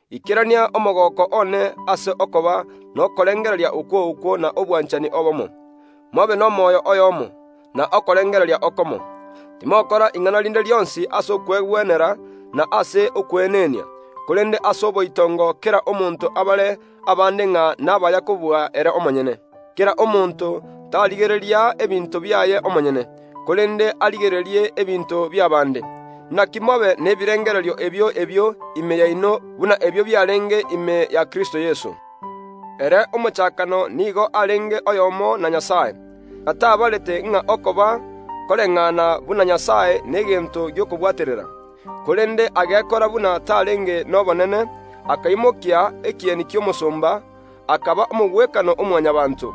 ikerania omogooko one ase okoba nokorengereria okwo okwo na obwanchani obomo; mobe nomoyo oyomo, na okorengereria okomo. Timokora ing’ana rinde rionsi ase okwegwenera na ase okweenenia, korende ase oboitongo kera omonto abare abande ng’a nabaya kobua ere omonyene. Kera omonto tarigereria ebinto biaye omonyene, korende arigererie ebinto bi’abaanto bande. Naki mobe nebirengererio ebio ebio ime yaino buna ebio biarenge ime ya Kristo Yeso. Ere omochakano nigo arenge oyomo na Nyasae, na tabarete ng’a okoba koreng’ana buna Nyasae negento gi’okobwaterera, korende agekora buna tarenge nobonene, akaimokia ekieni ki’omosomba, akaba omogwekano o Mwanyabaanto.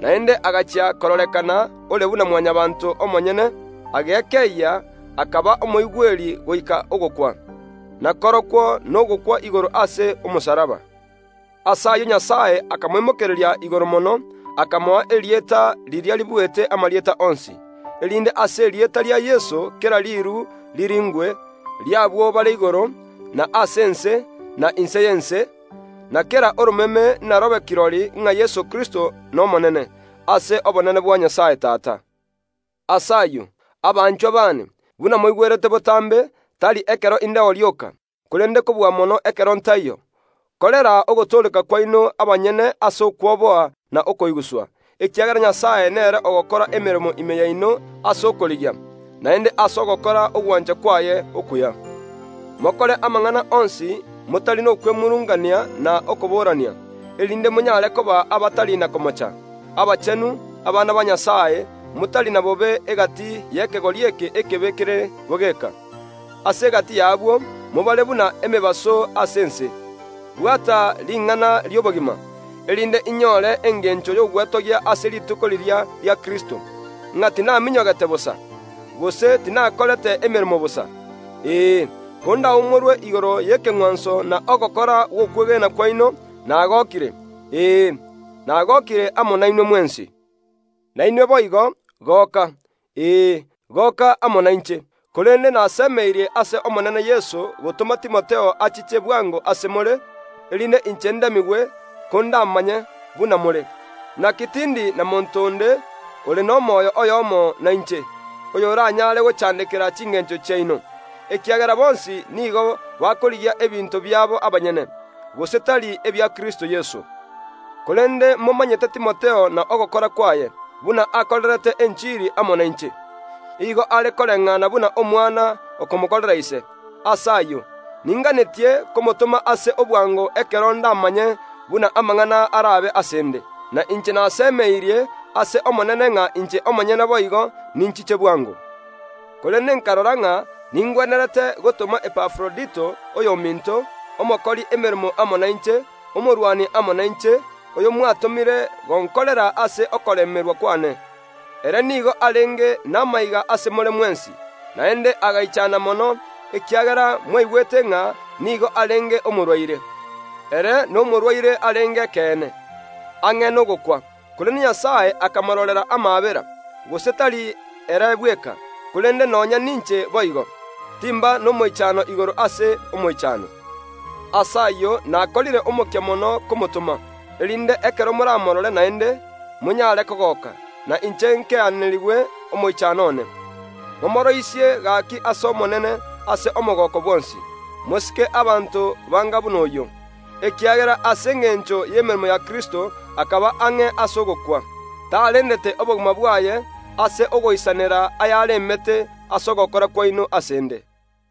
Naende agachia kororekana ore buna Mwanyabaanto omonyene, agekeyia, akaba omoigweri goika ogokwa, na korokwo nogokwa igoro ase omosalaba. Ase ayio Nyasae akamoimokereria igoro mono, akamoa erieta erio ribuete amarieta onsi, erinde ase erieta ria Yeso kera riiru riringwe, ri’abwo bare igoro, na ase ense, na inse y’ense, na kera oromeme narobe kirori ng’a Yeso Kristo n’Omonene, ase obonene bwa Nyasae Tata. Ase ayio, abanchwa baane, buna moigwerete botambe, tari ekero indeo rioka, korende kobua mono ekero ntaiyo, korera ogotooreka kwaino abanyene ase okwoboa na okoiguswa, ekiagera Nyasae nere ogokora emeremo ime yaino ase okorigia, naende ase ogokora ogwancha kwaye okuya. Mokore amang’ana onsi motari nokwemurungania na okoborania, erinde monyare koba abatari na komocha, abachenu, abana ba Nyasae, motari na bobe egati y’ekegori eke ekebe kere bogeka. Ase egati y’abwo mobare buna emebaso ase ense. Bwata ring’ana ri’obogima, erinde inyore engencho y’ogwetogia ase rituko riria ria Kristo, ng’a tinaminyogete bosa, gose tinakorete emeremo bosa. Ee, kondaumorwe igoro y’ekeng’wanso na ogokora gw’okwegena kwaino, nagokire; ee, nagokire amo nainwe mwensi. Nainwe boigo, goka, ee, goka amo nainche. Korende nasemeirie ase Omonene Yeso gotoma Timotheo achiche bwango ase more, erinde inche ndemigwe, kondamanye buna more. Naki tindi na monto onde ore nomoyo oyomo nainche, oyoranyare gochandekera chingencho chiaino, ekiagera bonsi nigo bakorigia ebinto biabo abanyene, gose tari ebia Kristo Yeso. Korende momanyete Timotheo na ogokora kwaye, buna akorerete enchiri amo nainche. Igo are koreng’ana buna omwana okomokorera ise. Ase ayio ninganetie komotoma ase obwango ekero ndamanye buna amang’ana arabe ase ’nde. Na inche nasemeirie ase Omonene ng’a inche omonyene boigo ninchiche bwango. Korende nkarora ng’a ningwenerete gotoma Epafrodito oyominto, omokori emeremo amo nainche, omorwani amo nainche, oyo mwatomire gonkorera ase okoremerwa kwane. Ere nigo arenge namaiga ase more mwensi, naende agaichana mono, ekiagera mwaigwete ng’a nigo arenge omorwaire. Ere nomorwaire arenge ekeene, ang’e nogokwa, korende Nyasae akamororera amaabera, gose tari ere bweka, korende nonya ninche boigo, timba nomoichano igoro ase omoichano. Ase ayio nakorire omokia mono komotoma, erinde ekero moramorore naende, monyare kogoka, na inche nkeeanerigwe omoichano one. Momooroisie gaki ase Omonene ase omogooko bwonsi. Mosike abanto banga buna oyio, ekiagera ase engencho y’emeremo ya Kristo akaba ang’e ase ogokwa, tarendete obogima bwaye ase ogoisanera ayaremete ase ogokora kwaino ase ’nde.